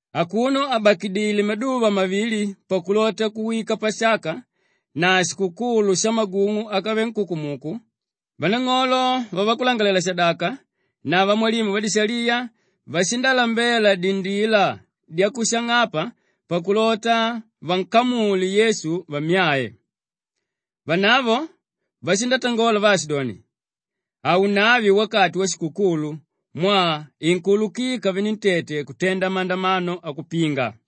Akuno àbakidile maduva mavili pakulota kuwika Pasaka na shikukulu shamagung'u ákavele nkukumuku, vanang'olo vavakulangalalela-shadaka na vamwalimu vadishaliya vashindalambela dindila dyakushang'apa pakulota vankamule Yesu vammyae. Vanavo vashindatangola vaashidoni, “Haunave wakati washikukulu mwaa inkuulukika venentete kutenda mandamano akupinga.”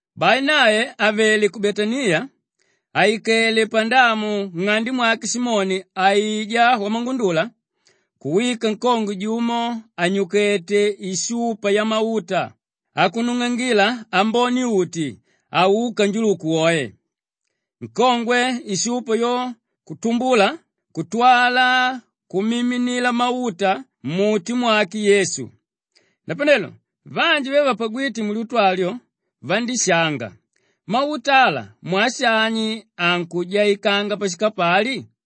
Bai nae àvele ku Betaniya, àikele pandamu nng'ande mwake Simoni aijá wamangundula, kuwika nkongwe jumo ànyukete ishupa yamauta akunung'angila ambone-uti aúka njuluku woe. Nkongwe ishupa yo kutumbula kutwala kumiminila mauta mmuti mwake Yesu. Napanelo vanji ve vapagwíte mulyutu alyo vandíshanga, “Mauta ala mwaa shani ankujaikanga pashikapali?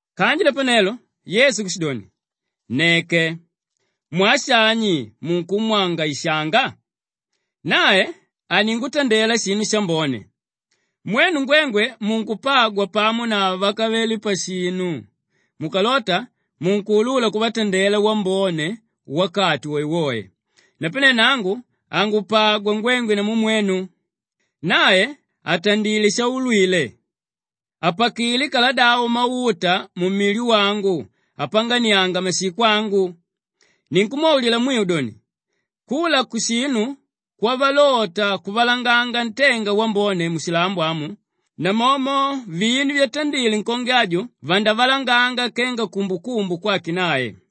Kanji napanelo Yesu kushidoni, “Nneke. Mwaa shani munkumwangaishanga? Nae aningutandela shinu shambone. Mwenu ngwengwe munkupagwa pamo na vákavele pashinu; mukalota munkuulula kuvatandela wambone wakati woewoe. Napane nangu hangupagwa ngwengwe namu mwenu. Nae atandilé shaulwile. Apakilé kaladavo mauta mumili wangu apanganianga mashiko angu. Ninkumwaulila mwiu doni, kula kushinu kwavalota kuvalanganga ntenga wambone mushilambo amu, namomo vinu vyatandile nkongwe aju vandavalanganga kenga kumbukumbu kwake nae.”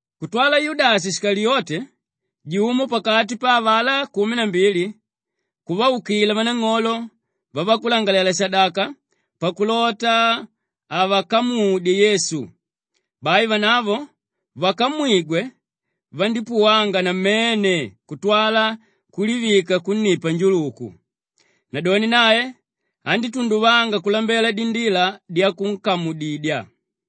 Kutwala Yudashi Shikaliyote, jumo pakati pa avalá kumi na mbili kuvaukila vanang'olo vavakulangalalela-shadaka pakulota avakamudye Yesu. Bai vanavo vakamwigwe, vandípuwanga namene kutwala kulivika kunnipa njuluku. Nadoni nae andítunduvanga kulambela dindila dyakuvakamudidya.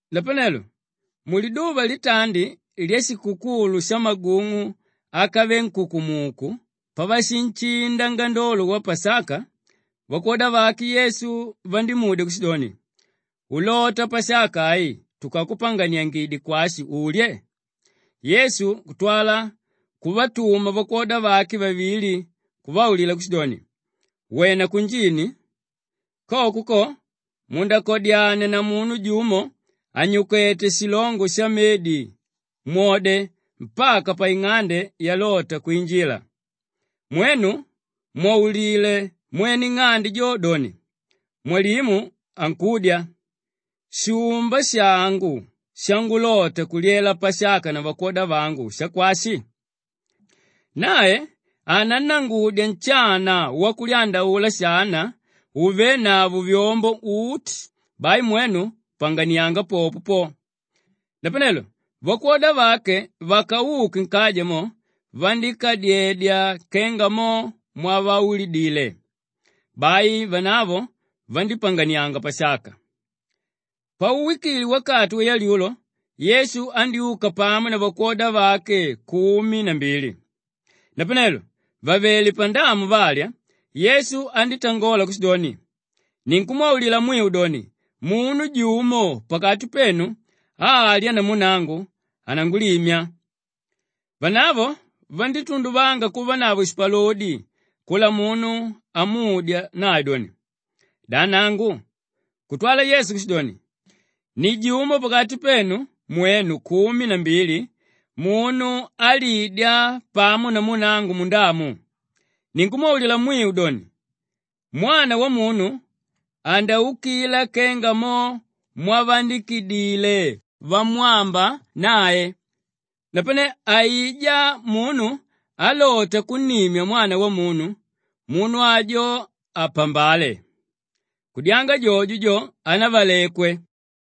Napanelo muliduva litandi lyashikukulu shamagung'u ákavele nkukumuku pavashinshinda ngandolo wa Pasaka, vakwoda vake Yesu vandímudya kushidoni, “Ulota Pasaka ai tukakupanganiangidye kwashi ulye?” Yesu kutwala kuvatuma vakwoda vake vavili kuvaulila kushidoni, “Wena kunjini. Koko ko mundakadyania na munu jumo ànyukete shilongo shamedi, mwode mpaka paing'ande yalota kwinjila. Mwenu mwaulile mwene ing'ande jo doni, ‘Mwalimu ankudya, “Shumba shangu shangulota kulyela Pasaka na vakwoda vangu shakwashi?” ’ Nae anannangudya nshana wakulyandaula shana úvenavo vyombo uti, bai mwenu panganianga popo po.” Napanelo vakwoda vake vakauke nkaja mo vandíkadyedya kenga mo mwavaulidile. Bai vanavo vandípanganianga Pasaka. Pauwikile wakati wayalyulo, Yesu andyúka pamo na vakwoda vake kumi na mbili. Napanelo vàvele pandamu valya, Yesu andítangola kushidoni, “Ninkumwaulila mwiu doni, munu jumo pakati penu álya namu nangu, anangulimya.” Vanavo vandítunduvanga kuvanavo shipalodi kula munu amudya nae doni, “Da nangu?” Kutwala Yesu kushidoni, “Ni jumo pakati penu mwenu kumi na mbili, munu álidya pamo namu nangu mundamu. Ninkumwaulila mwiu doni, Mwana Wamunu andaukila kenga mo mwavaandikidile vamwamba nae, napane aijá munu álota kunnimya Mwana Wamunu, munu ajo apambale! Kudyanga jojo jo, hanavalekwe.”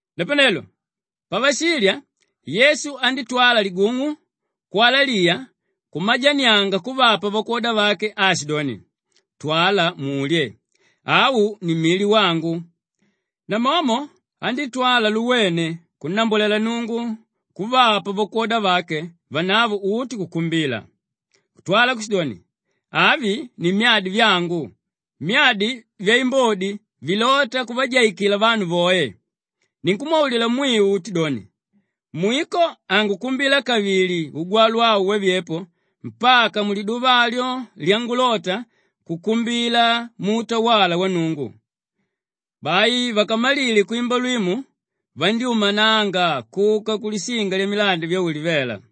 Napanelo pavashilya, Yesu andítwala ligung'u kwalaliya kumajanianga kuvapa vakwoda vake aashidoni, “Twala mulye. Au ni mili wangu.” Namomo andítwala luwene kunnambwalela Nnungu kuvapa vakwoda vake vanavo uti kukumbila. Kutwala kushidoni, “Avi ni myadi vyangu, myadi vyaimbodi vilóta kuvajaikila vanu voe. Ninkumwaulila mwiu uti doni, mwiko hangukumbila kavili ugwalwa au wavyepo mpaka muliduva alyo lyangulota kukumbila muutawala wa Nnungu.” Bai vakamalile kwimba lwimu vandyúmananga kuka kulishinga lyamilandi vya Ulivela.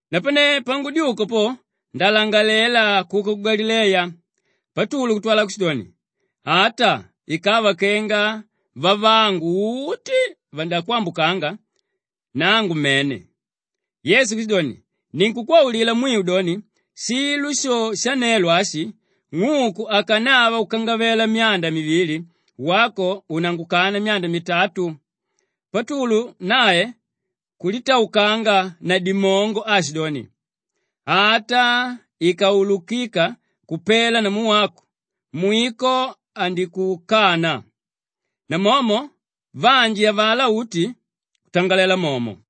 Napane pangudyuka po, ndalangalela kuka ku Galileya.” Patulu kutwala kushidoni, “Ata ikava kenga vavangu uti vandakwambukanga, nangu mene!” Yesu kushidoni, “Ninkukwaulila mwiu doni, shilo sho shanelo ashi, ng'uku akanava kukangavela myanda mivili, wako unangukana myanda mitatu.” Patulu nae kulitaukanga na dimongo aashidoni, “Ata ikaulukika kupela namu wako, mwiko handikukana.” Namomo vanji avalá uti kutangalela momo.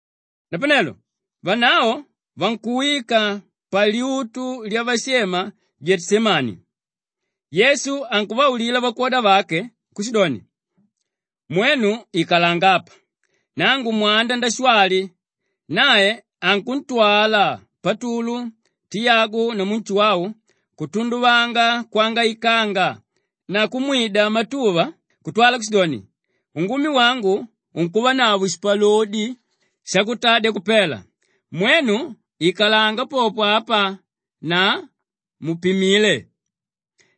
Napanelo vanavo vankuwika palyutu lyavashema Geteshemani. Yesu ankuvaulila vakwoda vake kushidoni, “Mwenu ikalanga apa nangu mwanda ndashwali.” Nae ankuntwala Patulu, Tiyagu namu Nshuwau kutunduvanga kwangaikanga na kumwida matuva kutwala kushidoni, “Ungumi wangu unkuvanavo shipalodi shakutadya kupela. Mwenu ikalanga popo apa na mupimile.”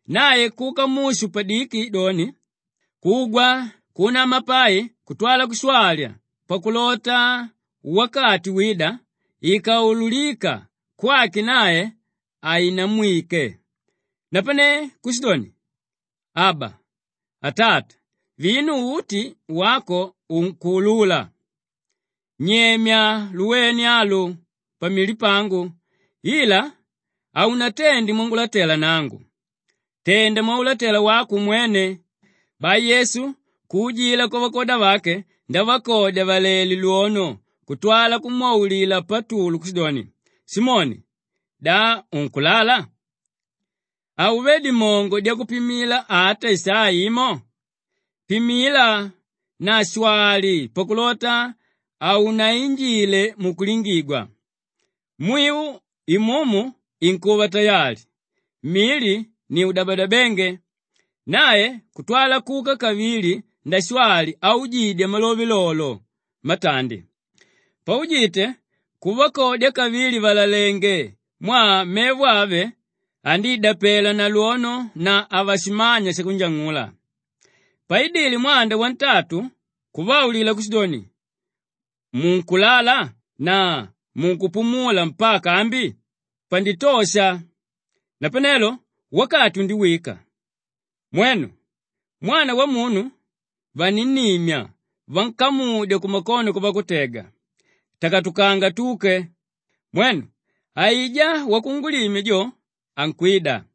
Nae kuka mushu padiki doni, kugwa kuunama pai kutwala kushwali pakulota wakati wída, ikaululika kwake nae haunamwike. Napane kushidoni, “Aba, Atata, vinu uti wako unkuulula. Nyemya luwene alu pamili pangu ila haunatende mwangulatela nangu, tenda mwaulatela wako umwene.” Bai Yesu kuujila kwavakwoda vake ndavakodya vàlalenge lwono kutwala kumwaulila Patulu kushidoni, “Simoni, da unkulala? Hauvé dimongo dyakupimila ata isaa imo? Pimila na shwali pakulota hamunainjile mukutubigwa. Mwiu imumu inkuva tayali, mili ni udabadabenge.” Nae kutwala kuka kavili ndashwali aujidya malove lolo matandi. Paujite kuvakodya kavili vàlalenge mwaa mevo ave andíidapelwa na lwono na havashimanya shakunjang'ula. Paidile mwanda wantatu kuvaulila kushidoni, “Munkulala na munkupumula mpaka ambi? Panditosha! Napanelo wakati undiwika. Mwenu! Mwana Wamunu vaninnimya vankamudya kumakono kwavakutega. Takatukanga tuke! Mwenu, aijá wakungulimya jo ankwida!”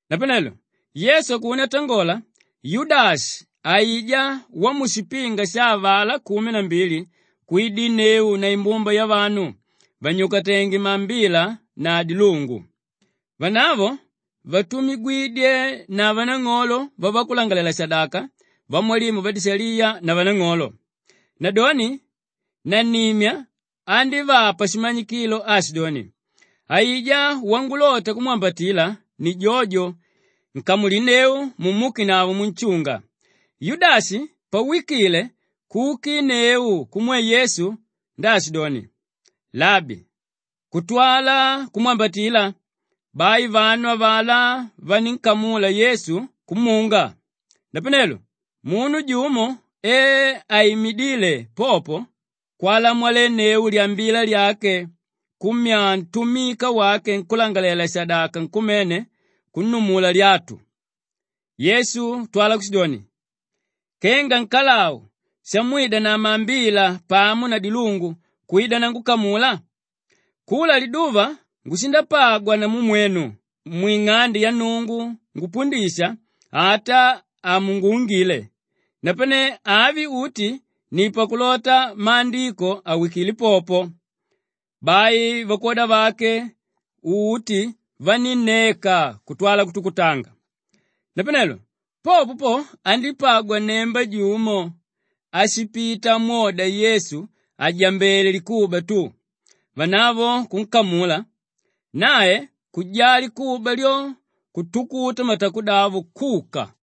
Napanelo Yesu akuno atangola, Yudashi aijá wamushipinga sha avalá kumi na mbili kwidinneu na imbumba yavanu vànyukatenge maambila na dilungu. Vanavo vatumigwidye na vanang'olo vavakulangalalela-shadaka, vamwalimu vadishaliya na vanang'olo. Nadoni nannimya andívapa shimanyikilo aashidoni, “Aijá wangulota kumwambatila ni jojo, nkamulinneu mumukenavo munshunga.” Yudashi pawikile kukinneu kumwe Yesu ndaashidoni, “Labi!” Kutwala kumwambatila. Bai vanu avalá vanínkamula Yesu kumunga. Napanelo munu jumo e aimidíle popo, kwalamolenneu lyambila lyake kumyaa ntumika wake nkúlangalalela-shadaka nkumene kunnumula lyatu. Yesu kutwala kushidoni, “Kenga nkalau shamwida na maambila pamo na dilungu kwida nangukamula? Kula liduva ngushipagwa namu mwenu mwing'ande ya Nnungu ngupundisha, ata hamunguungile. Napane avi uti ni pakulota Maandiko awikile popo.” Bai vakwoda vake uti vanínneka kutwala kutukutanga. Napanelo popo po, andípagwa nnemba jumo áshipita amwoda Yesu àjambele likuba tu. Vanavo kunkamula, nae kujaa likuba lyo kutukuta matakudavo kuka.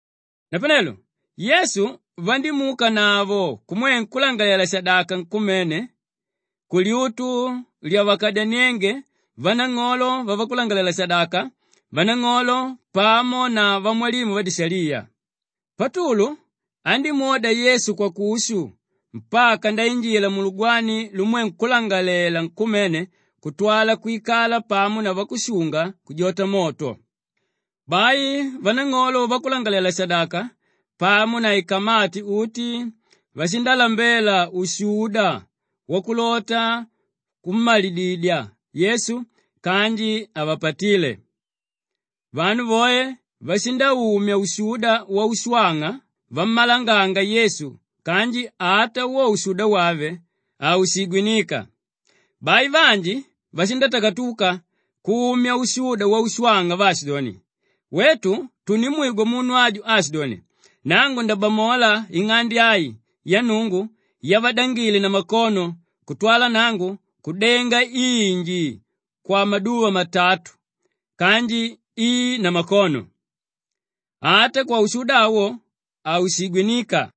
Napanelo Yesu vandímuukanavo kumwe nkúlangalalela-shadaka nkumene kulyutu lyavakadyaniénge vanang'olo vavakulangalalela-shadaka, vanang'olo pamo na vamwalimu vadishaliya. Patulu andímwoda Yesu kwakushu mpaka ndainjila mulugwani lumwe nkúlangalalela nkumene kutwala kwikala pamo na vakushunga kujota moto. Bai vanang'olo vavakulangalalela-shadaka pamo na ikamati uti, vashindalambela ushuda wakulota kummalididye Yesu kanji havapatíle. Vanu voe vashindaumya ushuda waushwang'a vammalanganga Yesu kanji ata wo ushuda wave, haushigwiníka. Bai vanji vandítakatuka kumya ushuda waushwang'a vaashidoni, “Wetu tundimwigwa munu aju aashidoni, ‘Nangu ndabamola ing'ande ai ya Nnungu yavadangile na makono kutwala nangu kudenga inji kwamaduva matatu kanji i namakono.’” Ata kwaushuda awo, haushigwiníka.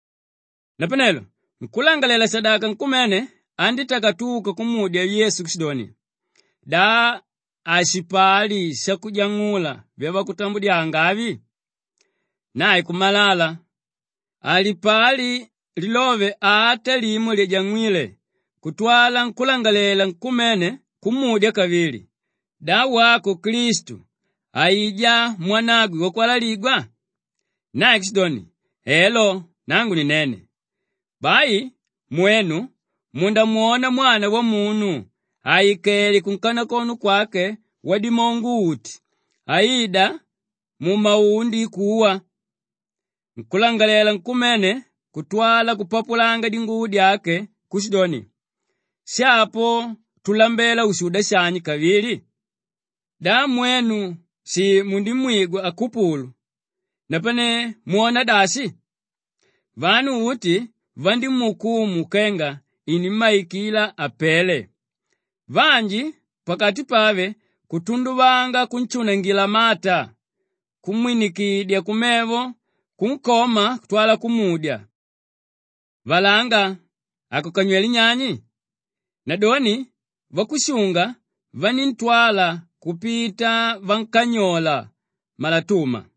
Napanelo nkúlangalalela-shadaka nkumene andítakatuka kumudya Yesu kushidoni, “Da hashipali shakujang'ula vyavakutambudyanga avi?” Nae kumalala. Halipali lilove ata limo lyajang'wíle kutwala nkúlangalalela nkumene kumudya kavili, “Da wako Klistu, aijá Mwanagwe Wakwalaligwa?” Nae kushidoni, “Elo, nangu ni nene. Bai mwenu mundamwona Mwana Wamunu àikele kunkanakono kwake Wadimongo-uti aida mumaundi kuwa.” Nkúlangalalela nkumene kutwala kupapulanga dinguvo dyake kushidoni, “Shapo tulambela ushuda shani kavili? Da mwenu shi mundimwigwa akupulu, napane mwona dashi?” Vanu uti vandimuukumu kenga inimmaikila apele. Vanji pakati pave kutunduvanga kunshunangila mata, kumwinikidya kumevo, kunkoma kutwala kumudya, “Valanga, akukanywelé nyani?” Nadoni vakushunga vaníntwala kupita vankanyola malatuma.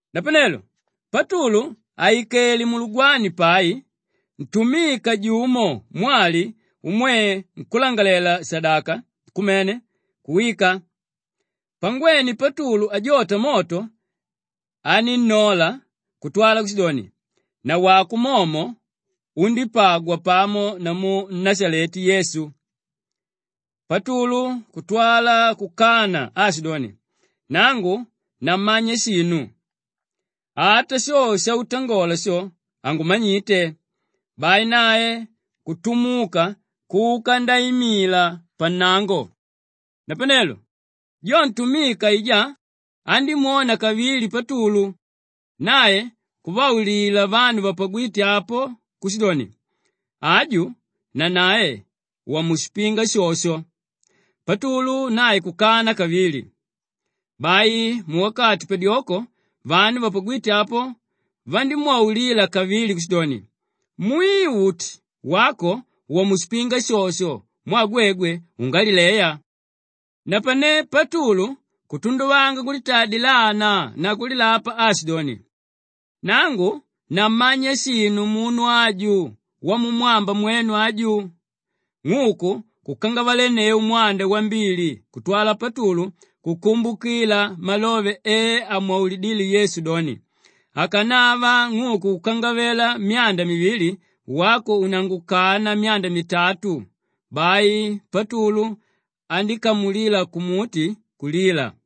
Napanelo Patulu àikele mulugwani pai, ntumika jumo mwali umwe nkúlangalalela-shadaka nkumene kuwika. Pangwene Patulu ajota moto, anínnola kutwala kushidoni, “Nawako momo undípagwa pamo namu Nnashaleti Yesu.” Patulu kutwala kukana aashidoni, “Nangu nammanya shinu. Ata sho shautangola sho, hangumanyite.” Bai nae kutumuka kuka ndaimila pannango. Napanelo jo ntumika aijá andímwona kavili Patulu, nae kuvaulila vanu vapagwíte apo kushidoni, “Aju nanae, wamushipinga shosho.” Patulu nae kukana kavili. Bai muwakati padyoko vanu vapagwíte apo, vandímwaulila kavili kushidoni, “Mwiu uti, wako wamushipinga shosho mwaa gwegwe, ungalileya.” Napane Patulu kutunduvanga kulitaa dilana na kulilapa aashidoni, “Nangu nammanya shinu munu aju wamumwamba mwenu aju.” Ng'uku kukangavalenneu mwanda wambili kutwala Patulu kukumbukila malove e amwaulidíle Yesu doni, “Akanava ng'uku kukangavela myanda mivili, wako unangukana myanda mitatu.” Bai Patulu andíkamulila kumuti kulila.